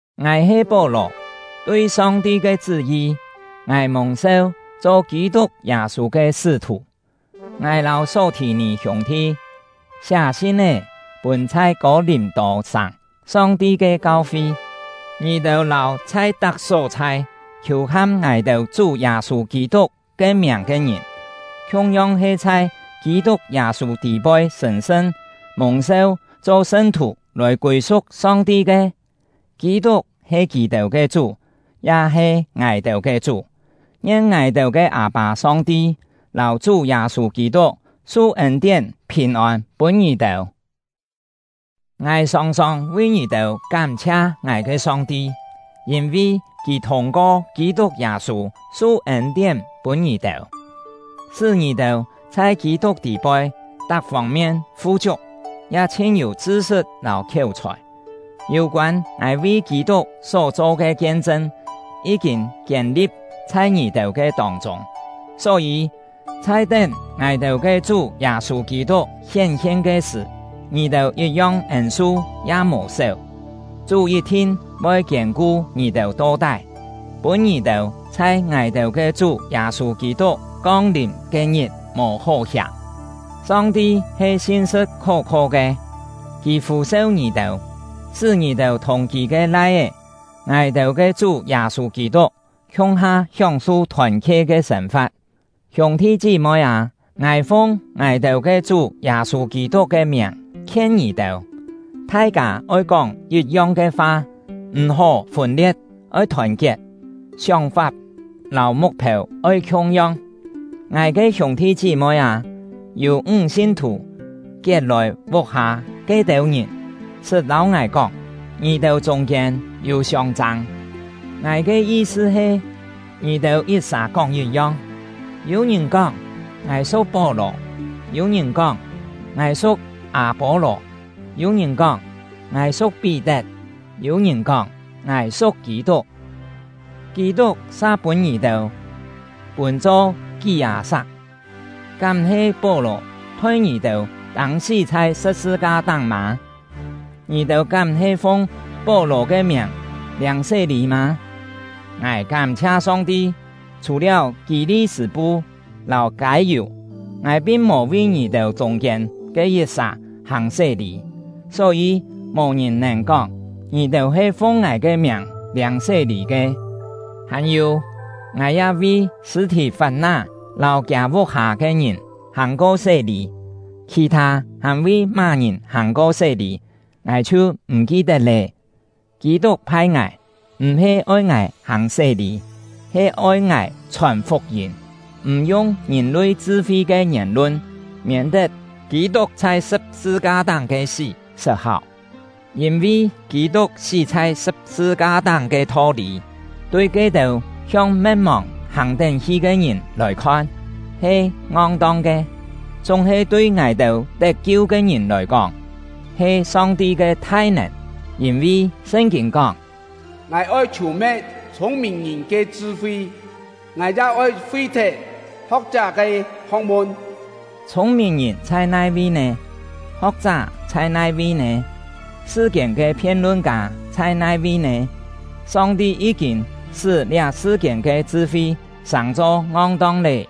Ngài he Pó-lò; tui Song-ti ke chṳ́-yi, ngài mùng-seu cho Kî-tuk Yâ-sû ke sṳ́-thù. Ngài lâu Só-thì-nì hiûng-thi, siá sin-é pûn chhai Kô-lìm-tô-sàng Song-ti ke kau-fi. Ngì-têu lâu chhai tak só-chhai khiù-ham ngài-têu Chú Yâ-sû Kî-tuk ke miàng ke ngìn, khiung-yong he chhai Kî-tuk Yâ-sû tî-poi sṳ̀n-sṳn, mùng-seu cho sṳn-thù lòi kûi-su̍k Song-ti ke. Kî-tuk he kì-têu ke Chú, ya he ngài-têu ke Chú. Ngien ngài-têu ke Â-pâ Song-ti lâu Chú Yâ-sû Kî-tuk su ên-tién, phìn-ôn pûn ngì-têu. Ngài sòng-sòng vi ngì-têu kám-chhia ngài ke Song-ti, yîn-vi Kì thûng-ko Kî-tuk Yâ-sû su ên-tién pûn ngì-têu, sṳ́ ngì-têu chhai Kî-tuk tî-poi tak fông-mien fu-chiuk, ya chhin-yû chṳ-sṳt lâu khiéu-chhòi. Yû-koân ngài vi Kî-tuk só-cho ke kien-chṳn, yí-kîn kiên-li̍p chhai ngì-têu ke tông-chûng, só-yî, chhai tén ngài-têu ke Chú Yâ-sû Kî-tuk hién-hien ke sṳ̀, ngì-têu yit-yong ên-su ya mò séu. Chú yit-thin voi kiên-ku ngì-têu to-tái, pûn ngì-têu chhai ngài-têu ke Chú Yâ-sû Kî-tuk kong-lìm ke-ngit mò hó hiàm. Song-ti he sin-sṳ̍t khó-kho ke; Kì fû-seu ngì-têu, sṳ́ ngì-têu thùng Kì ke Lai-é — ngài-têu ke Chú Yâ-sû Kî-tuk khiung-ha hióng-su thòn-khe ke sên-fa̍t. Hiûng-thi chí-moi â, ngài fung ngài-têu ke Chú Yâ-sû Kî-tuk ke miàng khien ngì-têu: Thai-kâ oi kóng yit-yong ke fa, m̀-hó fûn-lie̍t; oi thòn-kiet, sióng-fap lâu muk-phêu oi khiung-yong. Ngài ke hiûng-thi chí-moi â, yû ńg sin-thù Kiet-lòi vuk-hâ ke-têu ngìn sṳt lâu ngài kóng, ngì-têu chûng-kiên yû siông-châng. Ngài ke yi-sṳ he, ngì-têu yit-sà kóng yit-yong. Yû-ngìn kóng “Ngài su̍k Pó-lò”; yû-ngìn kóng “Ngài su̍k Â-pô-lò”; yû-ngìn kóng “Ngài su̍k Pí-tet”; yû-ngìn kóng “Ngài su̍k Kî-tuk”. Kî-tuk sa pûn ngì-têu pûn-cho kí-hâ sak! Kám-he Pó-lò thoi ngì-têu tâng-sí chhai sṳ̍p-sṳ-ka-táng mâ? Ngì-têu kám-he fung Pó-lò ke miàng liâng sé-lî mâ? Ngài kám-chhia Song-ti, chhù-liáu Kî-li-sṳ̂-pu lâu Kâi-yù, ngài pin mò vi ngì-têu chûng-kiên ke yit-sà hàng sé-lî, só-yî, mò-ngìn nèn kóng, ngì-têu he fung ngài ke miàng liâng sé-lî ke. (Hàn-yû, ngài ya vi Sṳ̂-thì-fap-ná lâu kiâ vuk-hâ ke ngìn hàng-ko sé-lî, khì-thâ hàn vi má-ngìn hàng-ko sé-lî, ngài chhiu m̀ ki-tet lé.) Kî-tuk phai ngài, m̀-he oi ngài hàng sé-lî, he oi ngài chhòn fuk-yîm, m̀ yung ngìn-lui chṳ-fi ke ngièn-lun, miên-tet Kî-tuk chhai sṳ̍p-sṳ-ka-táng ke sí sṳt-háu. Yîn-vi Kî-tuk sí chhai sṳ̍p-sṳ-ka-táng ke tho-lî, tui ke-têu hiong me̍t-mòng hàng-tén hi ke ngìn lòi-khon, he ngong-tong ke; chúng-he tui ngài-têu tet-kiu ke ngìn lòi-kóng, he Song-ti ke thai-nèn. Yîn-vi Sṳn-kîn kóng: Ngài oi chhù-me̍t chhûng-mìn-ngìn ke chṳ-fi; Ngài ya oi fi-thet ho̍k-chá ke ho̍k-mun. Chhûng-mìn-ngìn chhai nai-vi nè? Ho̍k-chá chhai nai-vi nè? Sṳ-kiên ke phien-lun-kâ chhai nai-vi nè? Song-ti yí-kîn sṳ́ liá sṳ-kiên ke chṳ-fi sàng-cho ngong-tong lé!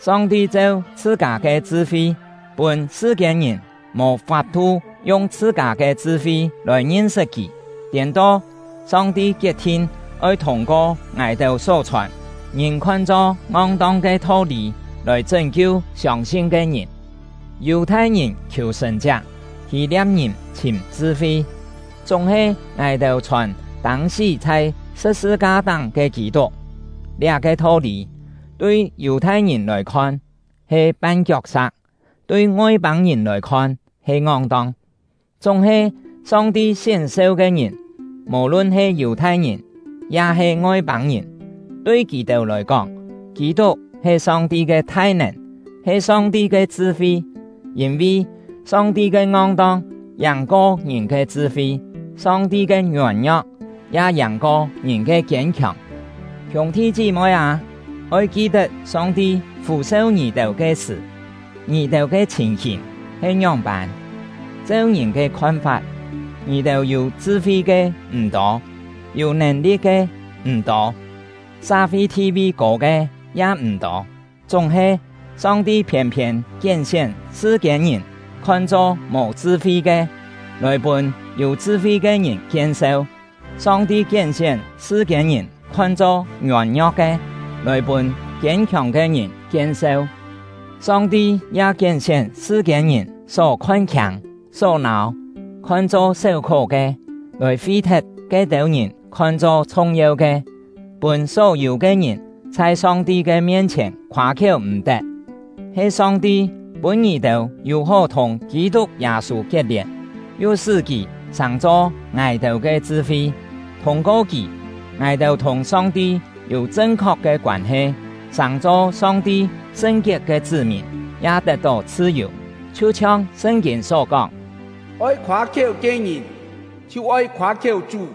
Song-ti cheu chhṳ-kâ ke chṳ-fi, pûn sṳ-kiên-ngìn mò fap-thu yung chhṳ-kâ ke chṳ-fi lòi ngin-sṳt Kì; tiên-to, Song-ti kiet-thin oi thûng-ko ngài-têu só chhòn, ngìn khon-cho “ngong-tong” ke tho-lî lòi chṳ́n-kiu siông-sin ke ngìn. Yù-thai-ngìn khiù sṳ̀n-chiak, Hî-lia̍p-ngìn chhìm chṳ-fi, chúng-he ngài-têu chhòn tâng-sí chhai sṳ̍p-sṳ-ka-táng ke Kî-tuk. Liá-ke tho-lî, tui Yù-thai-ngìn lòi-khon he pan-kiok-sa̍k, tui Ngoi-pâng-ngìn lòi-khon he ngong-tong; chúng-he Song-ti sién-seu ke ngìn, mò-lun he Yù-thai-ngìn ya-he Ngoi-pâng-ngìn, tui kì-têu lòi-kóng, Kî-tuk he Song-ti ke thai-nèn, he Song-ti ke chṳ-fi. Yîn-vi, “Song-ti ke ngong-tong” yàng-ko ngìn ke chṳ-fi; “Song-ti ke ngiôn-ngio̍k” ya yàng-ko ngìn ke kiên-khiòng. Hiûng-thi chí-moi â, oi ki-tet Song-ti fû-seu ngì-têu ke sṳ̀, ngì-têu ke chhìn-hìn he ngióng-pân. Cheu ngìn ke khon-fap, ngì-têu yû chṳ-fi ke m̀ tô, yû nèn-li̍t ke m̀ tô, sa-fi thi-vi kô ke ya m̀ tô. Chúng-he, Song-ti phiên-phiên kién-sién sṳ-kiên-ngìn khon-cho mò chṳ-fi ke, lòi pûn yû chṳ-fi ke ngìn kien-seu; Song-ti kién-sién sṳ-kiên-ngìn khon-cho ngiôn-ngio̍k ke, lòi pûn kiên-khiòng ke ngìn kien-seu. Song-ti ya kién-sién sṳ-kiên-ngìn só khon-khiâng, só nâu, khon-cho séu-khó ke, lòi fi-thet ke-têu ngìn khon-cho chhung-yeu ke, pûn só-yû ke ngìn chhai Song-ti ke mien-chhièn khoâ-khiéu m̀-tet. He Song-ti pûn ngì-têu yû-hó thùng Kî-tuk Yâ-sû kiet-lièn, yu sṳ́ kì sàng-cho ngài-têu ke chṳ-fi; thûng-ko kì, ngài-têu thùng Song-ti yû chṳn-khok ke koân-he, sàng-cho Song-ti sṳn-kiet ke chṳ́-mìn, ya tet-tó chhṳ-yù. Chhiu-chhiong Sṳn-kîn só kóng: “Oi khoâ-khiéu ke ngìn, chhiu oi khoâ-khiéu Chú.”